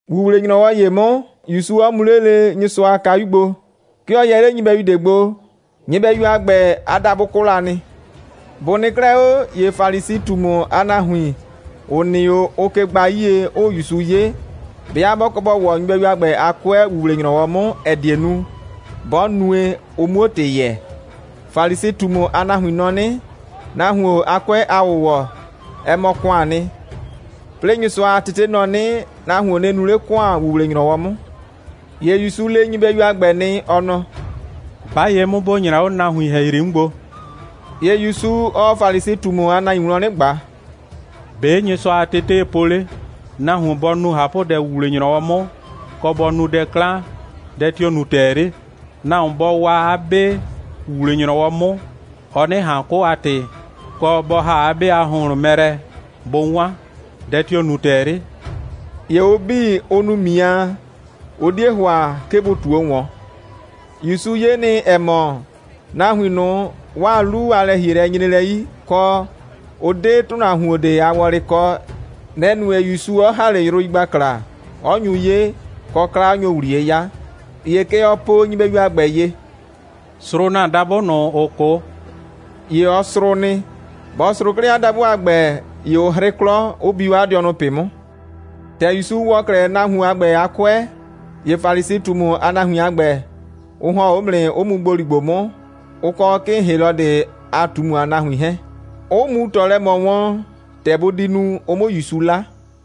‑Wuwle‑nyrɔwɔ ‑ye 'mʋ, ‑Yusu 'ɔ mu 'le lele Nyɩsʋa a kayu gbo. 'Ke ɔ yɛ 'le nyɩbɛyu ꞊de gbo. Nyɩbɛyu a ‑gbɛ, 'a dabʋ 'kʋ la nɩ. Bʋ nɩ 'klɛɛ 'o, ‑ye Falisi꞊tumu a nahuin, ‑ʋ nɩ 'o, ʋʋ ke gbaa 'yie, 'ʋʋ ‑Yusu 'ye, 'bɩa 'bɔ kɔ bɔ ‑wɔ nyɩbɛyu a ‑gbɛ a 'kʋɛ ‑wuwle‑nyrɔwɔ 'mʋ, ‑ɛ die nu, 'bɔ nue, ʋ 'muo ‑tɩ yɛɛ. (Falisi꞊tumu a nahuin nɔ 'nɩ, nahuon a 'kʋɛ a ‑wʋwɔ, ɛ mɔ ‑kʋaan nɩ. 'Plɩɩ Nyɩsʋa a tete nɔ 'nɩ, nahuon nɩ nu 'le ‑kʋan ‑wuwle‑nyrɔwɔ 'mʋ.) ‑Ye ‑Yusu le nyɩbɛyu a ‑gbɛ nɩ, ɔ nɔ: «'Ba ye 'mʋ, ‑bo nyra 'o nahuin ‑hɛyri 'mʋ gbo!» ‑Ye ‑Yusu, ɔɔ Falisi꞊tumu a nahuin wlɔn 'nɩ ꞊gba: «‑Be' Nyɩsʋa a tetee po 'le? Nahuon bɔ nu ꞊hapʋdɛ ‑wuwle‑nyrɔwɔ 'mʋ, kɔ, bɔ nu dɛ 'klan, dɛ tio‑ nu ‑tɛɛ 'le? Nahuon bɔ waa 'a 'be ‑wuwle‑nyrɔwɔ 'mʋ, ɔ 'nɩ ꞊han 'kʋ a ‑tɩ, kɔ, bɔ ‑ha 'a 'be a ‑hʋnhlʋn mɛ lɛ bʋ 'wan, dɛ tio‑ nu ‑tɛɛ 'le?» ‑Ye ʋ 'bii, ʋ nu ‑miaa. Ʋ 'die ‑hʋa, 'ke bʋ ꞊tuo ‑wɔn. ‑Yusu 'ye nɩ, ‑ɛ mɔ, nahuin ꞊nʋ, 'waa 'lu a lɛ‑hielɛ nyre lɛ 'yi, kɔ, ʋ 'de nahuon ꞊de a wɔlɩ kɔ. Nɛ‑ nue, ‑Yusu 'ɔ ‑ha 'le yrʋ yigbakla, 'ɔ nyu 'ye, kɔ, 'kla 'ɔ nyo ‑wɛ ‑wliye 'yaa. ‑Ye kɛ ɔ po nyɩbɛyu a ‑gbɛ ye: «Srʋʋ ‑na dabʋ ꞊nʋ, ‑ʋ 'kʋ!» ‑Ye ɔ srʋʋ nɩ. Bɔ srʋʋ 'klɛɛ 'a dabʋ a ‑gbɛ, ‑ye ʋ 'hrɩ 'klɔ, 'ʋ bi 'o 'a dɩɔnʋ ꞊pɩ 'mʋ. ‑Tɛ ‑Yusu ‑wɔ 'klɛɛ nahuon a ‑gbɛ a 'kʋɛ, ‑ye Falisi꞊tumu a nahuin a ‑gbɛ, ʋ ‑hɔn 'o 'mʋ nɩ, 'ʋ mu ‑gboligbo 'mʋ, ʋ kɔ 'kɩɩn Helɔdɩ a ꞊tumu a nahuin 'hɛɛn, 'ʋ mu ꞊tɔ lɛ ꞊mɔ wɔn, ‑tɛ bʋ di nu, ʋ 'mʋ ‑Yusu 'la.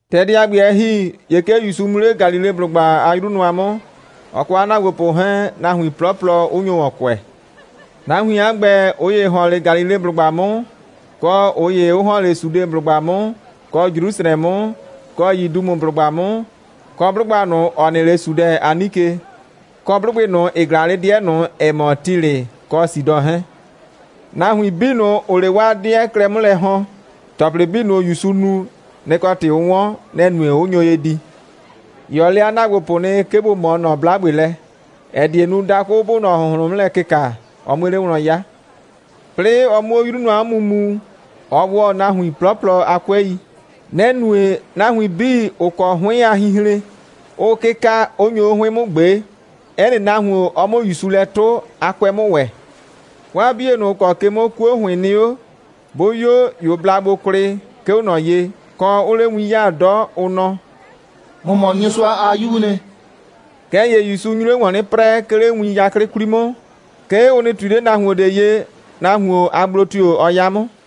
‑Tɛ dɛ a ‑gbɛ, ɛ ‑hi, ‑ye 'ke ‑Yusu mu 'le Galileblʋgba a 'yru nʋa 'mʋ, ɔ kɔ 'a ‑naagbopʋ 'hɛɛn, nahuin 'plɔplɔ 'ʋ nyo ‑wɔn kʋɛ. Nahuin a ‑gbɛ, ꞊ʋ ‑ye ‑hɔn 'le Galileblʋgba 'mʋ, kɔ ꞊ʋ ‑ye 'ʋ ‑hɔn 'le Sudeblʋgba 'mʋ, kɔ Jrusrɛ 'mʋ, kɔ Yidumeblʋgba 'mʋ, kɔ 'blʋgba ꞊nʋ, ‑ɔ nɩ 'le Sudɛn a 'nike, kɔ 'blʋgbɩ ꞊nʋ, ‑ɩ ꞊glaa 'le 'dɩɛ ꞊nʋ, ‑ɛ mɔ Tilɩ kɔ Sidɔ 'hɛɛn. Nahuin 'bii ꞊nʋ, ‑ʋʋ 'le 'waa 'dɩɛ klɛ 'mʋ lɛ ‑hɔn, ‑tɔplɩ 'bii ꞊nʋ, ‑Yusu nu, nɩ‑ kɔ ‑tɩ ʋ 'wɔn. Nɛ‑ nue, 'ʋ nyo ye di. ‑Ye ɔ le 'a ‑naagbopʋ nɩ, 'ke bʋ ꞊mɔɔ ꞊nɔ 'blagbe lɛ, ‑ɛ die nu, dakʋ 'bʋʋ ꞊nɔ ‑hʋnhlʋn 'mʋ lɛ kɩka, ɔ 'mue 'le wlɔn 'ya. 'Plɩɩ ɔ 'mʋ 'le 'yru nʋa 'mʋ mu, ɔ ‑wɔ nahuin 'plɔplɔ a 'kʋɛi. Nɛ‑ nue, nahuin 'bii, ‑ʋ kɔ 'hʋɩn a hinhren, 'ʋʋ 'kɩka, 'ʋ nyo 'o 'hʋɩn 'mʋ ꞊gbee, 'ɛ nɩ nahuon, ɔ 'mʋ ‑Yusu lɛ 'tʋ, 'a 'kʋɛ 'mʋ ‑wɛ. 'Waa 'bie ꞊nʋ, ‑ʋ kɔ ke 'mʋ 'kuo ‑hʋɩn nɩ 'o, 'bʋ 'yo, ‑ye ʋ bla gbo kwlɩ, 'ke 'o ꞊nɔ ye, kɔ, 'ʋʋ 'le win 'le 'yaa 'dɔ, ʋ nɔ: «‑Mɔ mɔ Nyɩsʋa a 'Yuu nɩ.» Kɛɛ ‑ye ‑Yusu nyu 'le ‑wɔn 'nɩ 'prɛɛ, 'ke 'le win 'yaklɩ 'kwli 'mʋ, 'ke ʋ nɩ ꞊tui 'le nahuon ꞊de ye, nahuon a gblo tio‑ bɔ 'ya 'mʋ.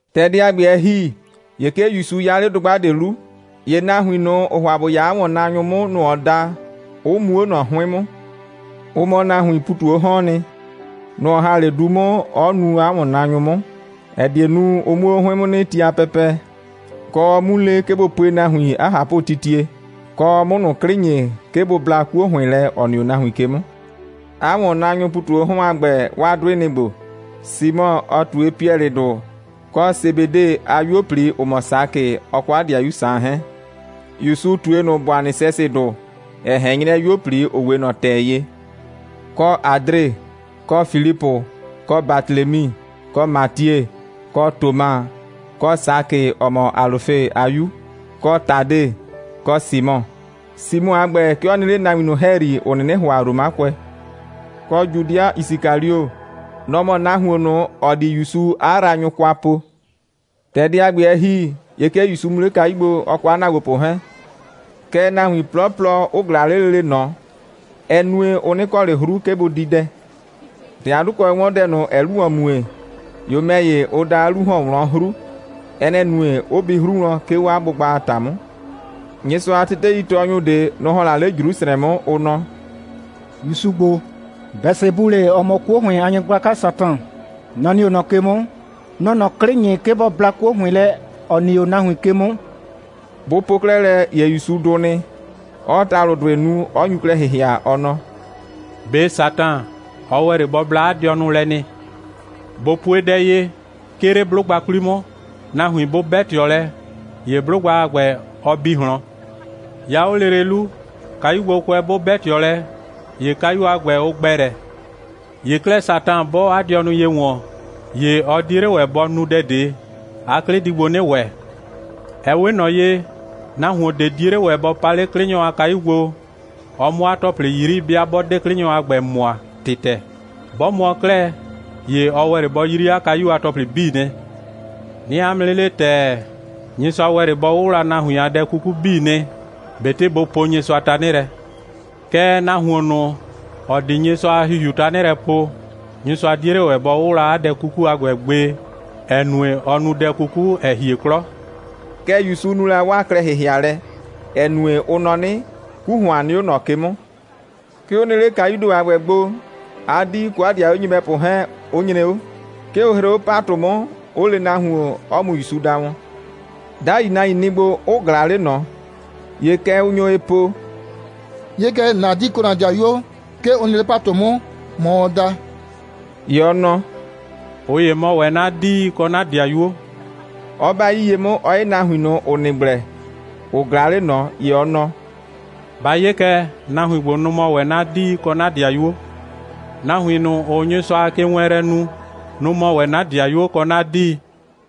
Dɛ a ‑gbɛ, ‑tɛ ɛ ‑hi, ‑ye 'ke ‑Yusu 'ya 'le dʋgba ꞊de 'lu. ‑Ye nahuin ꞊nʋ, ɔɔ ‑hʋa ‑bʋ 'ya 'a ‑wɔnnaanyʋ 'mʋ, nʋ‑ ɔ da, 'ʋ mu 'o ꞊nɔ 'hʋɩn 'mʋ. Ʋ mɔ nahuiin ‑pu ꞊tu 'o 'hɔɔn nɩ. Nʋ‑ ɔ ‑ha 'le du 'mʋ, 'ɔ nuu ꞊nʋ 'a ‑wɔnnaanyʋ 'mʋ, ‑ɛ die nu, ʋ 'muo 'o 'hʋɩn 'mʋ nɩ ti a pɛpɛ, kɔ, ɔ 'mu le, 'ke bʋ pue nahuin 'a ꞊hapʋtitie, kɔ, ɔ 'mʋ ꞊nʋ 'klɩ ‑nyi, 'ke bʋ bla 'kuo ‑hʋɩn lɛ, ‑ɔ nɩ 'o nahuin ke 'mʋ. 'A ‑wɔnnaanyʋʋ ‑pu ꞊tu 'o 'hɔn a ‑gbɛ, 'waa 'dʋɩ, ɩ nɩ‑ ‑gbo: Simɔ, ɔ ꞊tue Piɛlɩdʋ, kɔ Sebede a 'yuo꞊pli, ‑ʋ mɔ Sakɩ, ɔ kɔ 'a 'dɩayu Saan 'hɛɛn. ‑Yusu ꞊tue ꞊nʋ Bʋanɩsɛsɩdʋ, ‑ɛ ꞊hɛn 'nyrɛ 'yuo꞊pli, ‑ʋ 'we ꞊nɔ ‑tɛ ye; kɔ Adre, kɔ Filipʋ, kɔ Batelemi, kɔ Matie, kɔ Toma, kɔ Sakɩ, ‑ɔ mɔ Alʋfe a 'yu, kɔ Tade, kɔ Simɔ. Simɔ a ‑gbɛ, 'ke ɔ nɩ 'le nahuin ꞊nʋ ‑hɛyri, ‑ʋ 'nɩnɩ ‑hʋa Romakʋɛ; kɔ Judɩa Yisikalio. Nɔ‑ mɔ nahuon ꞊nʋ, ‑ɔ di ‑Yusu 'a yraanyʋ kwa po. ‑Tɛ dɛ a ‑gbɛ, ɛ ‑hi, ‑ye 'ke ‑Yusu mu 'le kayu gbo, ɔ kɔ 'a ‑naagbopʋ 'hɛɛn, kɛɛ, nahuin 'plɔplɔ 'ʋ ꞊glaa 'le lele ꞊nɔ. Ɛ nue, ʋ 'nɩ kɔ ꞊le 'hru, 'ke bʋ di dɛ. ‑Tɛ 'a 'dʋkʋɛ 'wɔn dɛ ꞊nʋ, ‑ɛɛ 'lu ‑wɔn mue, ‑ye ʋ ‑mɛ ‑ye, ʋ da, 'a 'lu ‑hɔn 'o wlɔn 'mʋ 'hru. Ɛ nɛ‑ nue, 'ʋ bi 'hru wlɔn, 'ke 'o 'a gbʋgba a ‑ta 'mʋ. Nyɩsʋa a teteitɔɔnyʋ ꞊de, nʋ‑ ‑hɔn la 'le Jrusrɛ 'mʋ, ʋ nɔ: «‑Yusu ‑gbo, Bɛsebulɩ, ‑ɔ mɔ 'kuo ‑hʋɩn a nyɩgblaka Satan, nɔ‑ nɩ 'o ꞊nɔ ke 'mʋ, nɔ‑ɔ ꞊nɔ 'klɩ ‑nyi, 'ke bɔ bla 'kuo ‑hʋɩn lɛ, ‑ɔ nɩ 'o nahuin ke 'mʋ.» Bʋ po 'klɛɛ lɛ, ‑ye ‑Yusu dʋ nɩ, 'ɔɔ ‑talʋdʋɩ nu, 'ɔ nyu klɛ ‑hɩhɩa, ɔ nɔ: «꞊Be Satan, ɔ ‑wɛ 'le bɔ bla 'a dɩɔnʋ lɛ nɩ? ꞊Bo pue dɛ ye: 'Ke 'le 'blʋgba 'kwli 'mʋ, nahuin 'bʋ 'bɛ ꞊tɩɔ lɛ, ‑ye 'blʋgba a ‑gbɛ, ɔ bi ꞊hlɔn. 'Ya 'o lele 'lu, kayugbokʋɛ 'bʋ 'bɛ ꞊tɩɔ lɛ, ‑ye kayu a ‑gbɛ, ʋ ‑gbɛ lɛ. ‑Ye 'klɛɛ, Satan 'bɔɔ 'a dɩɔnʋ ye ‑wɔn, ‑ye ɔ 'die 'le ‑wɛ bɔ nu dɛ ꞊de, 'a 'klɩ di gbo 'nɩ ‑wɛ. Ɛ 'we ꞊nɔ ye, nahuon ꞊de 'die 'le ‑wɛ bɔ pa 'le 'klɩnyɔ a kayu gbo, ɔ 'mʋ 'a ‑tɔplɩ 'yri, 'bɩa 'bɔ 'de 'klɩnyɔ a ‑gbɛ mʋa ‑tɩtɛ. 'Bɔ mʋɔ 'klɛɛ, ‑ye ɔ ‑wɛ 'le bɔ 'yri 'a kayu a ‑tɔplɩ 'bii nɩ. 'Nɩɩ 'a mʋ 'nɩ le ‑tɛɛ, Nyɩsʋa ‑wɛ 'le bɔ 'wʋwla nahuin a dɛ 'kuku 'bii nɩ, ꞊betɩ bʋ poo Nyɩsʋa tanɩ lɛ. Kɛɛ, nahuon ꞊nʋ, ‑ɔ di Nyɩsʋa a ‑Hihiu tanɩ lɛ poo, Nyɩsʋa 'die 'le ‑wɛ bɔ 'wʋwla 'a dɛ 'kuku a ‑gbɛ gbe, ‑ɛ nue, ɔ nu dɛ 'kuku, ‑ɛ hie 'klɔ.» Kɛ ‑Yusu nu la 'waa klɛ‑hɩhɩalɛ, ‑ɛ nue, ʋ nɔ 'nɩ, 'ku ‑hʋan nɩ 'o ꞊nɔ ke 'mʋ. 'Ke ʋ nɩ 'le kayuu ‑do a ‑gbɛ gbo, 'a 'dii kɔ 'a 'dɩayuo nyɩbɛpʋ 'hɛɛn 'ʋ nyre 'o. 'Ke ʋ hree 'o ‑patʋ 'mʋ, 'ʋ le nahuon, 'ɔ mu ‑Yusu da wɔn. 'Dai nahuin nɩ gbo, 'ʋ ꞊glaa 'le ꞊nɔ. ‑Ye kɛ ʋ nyo ye po: «'Ye kɛ, ‑na 'dii kɔ ‑na 'dɩayuo, 'ke ʋ nɩ 'le ‑patʋ 'mʋ, ‑mɔ ʋʋ da.» ‑Ye ɔ nɔ: «꞊Ʋ ‑ye mɔ ‑wɛ 'na 'dii kɔ 'na 'dɩayuo,» 'ɔ 'ba 'yii ye 'mʋ, 'ɔ 'ye nahuin ꞊nʋ, ‑ʋ nɩ gblɛ, ‑ʋ ꞊glaa 'le ꞊nɔ, ‑ye ɔ nɔ: «Ba 'ye kɛ, nahuin ‑gbo, nʋ‑ mɔ ‑wɛ 'na 'dii kɔ 'na 'dɩayuo. Nahuin ꞊nʋ, ‑ʋʋ Nyɩsʋa a kewɛɛnlɛ nu, nʋ‑ mɔ ‑wɛ 'na 'dɩayuo kɔ 'na 'dii.»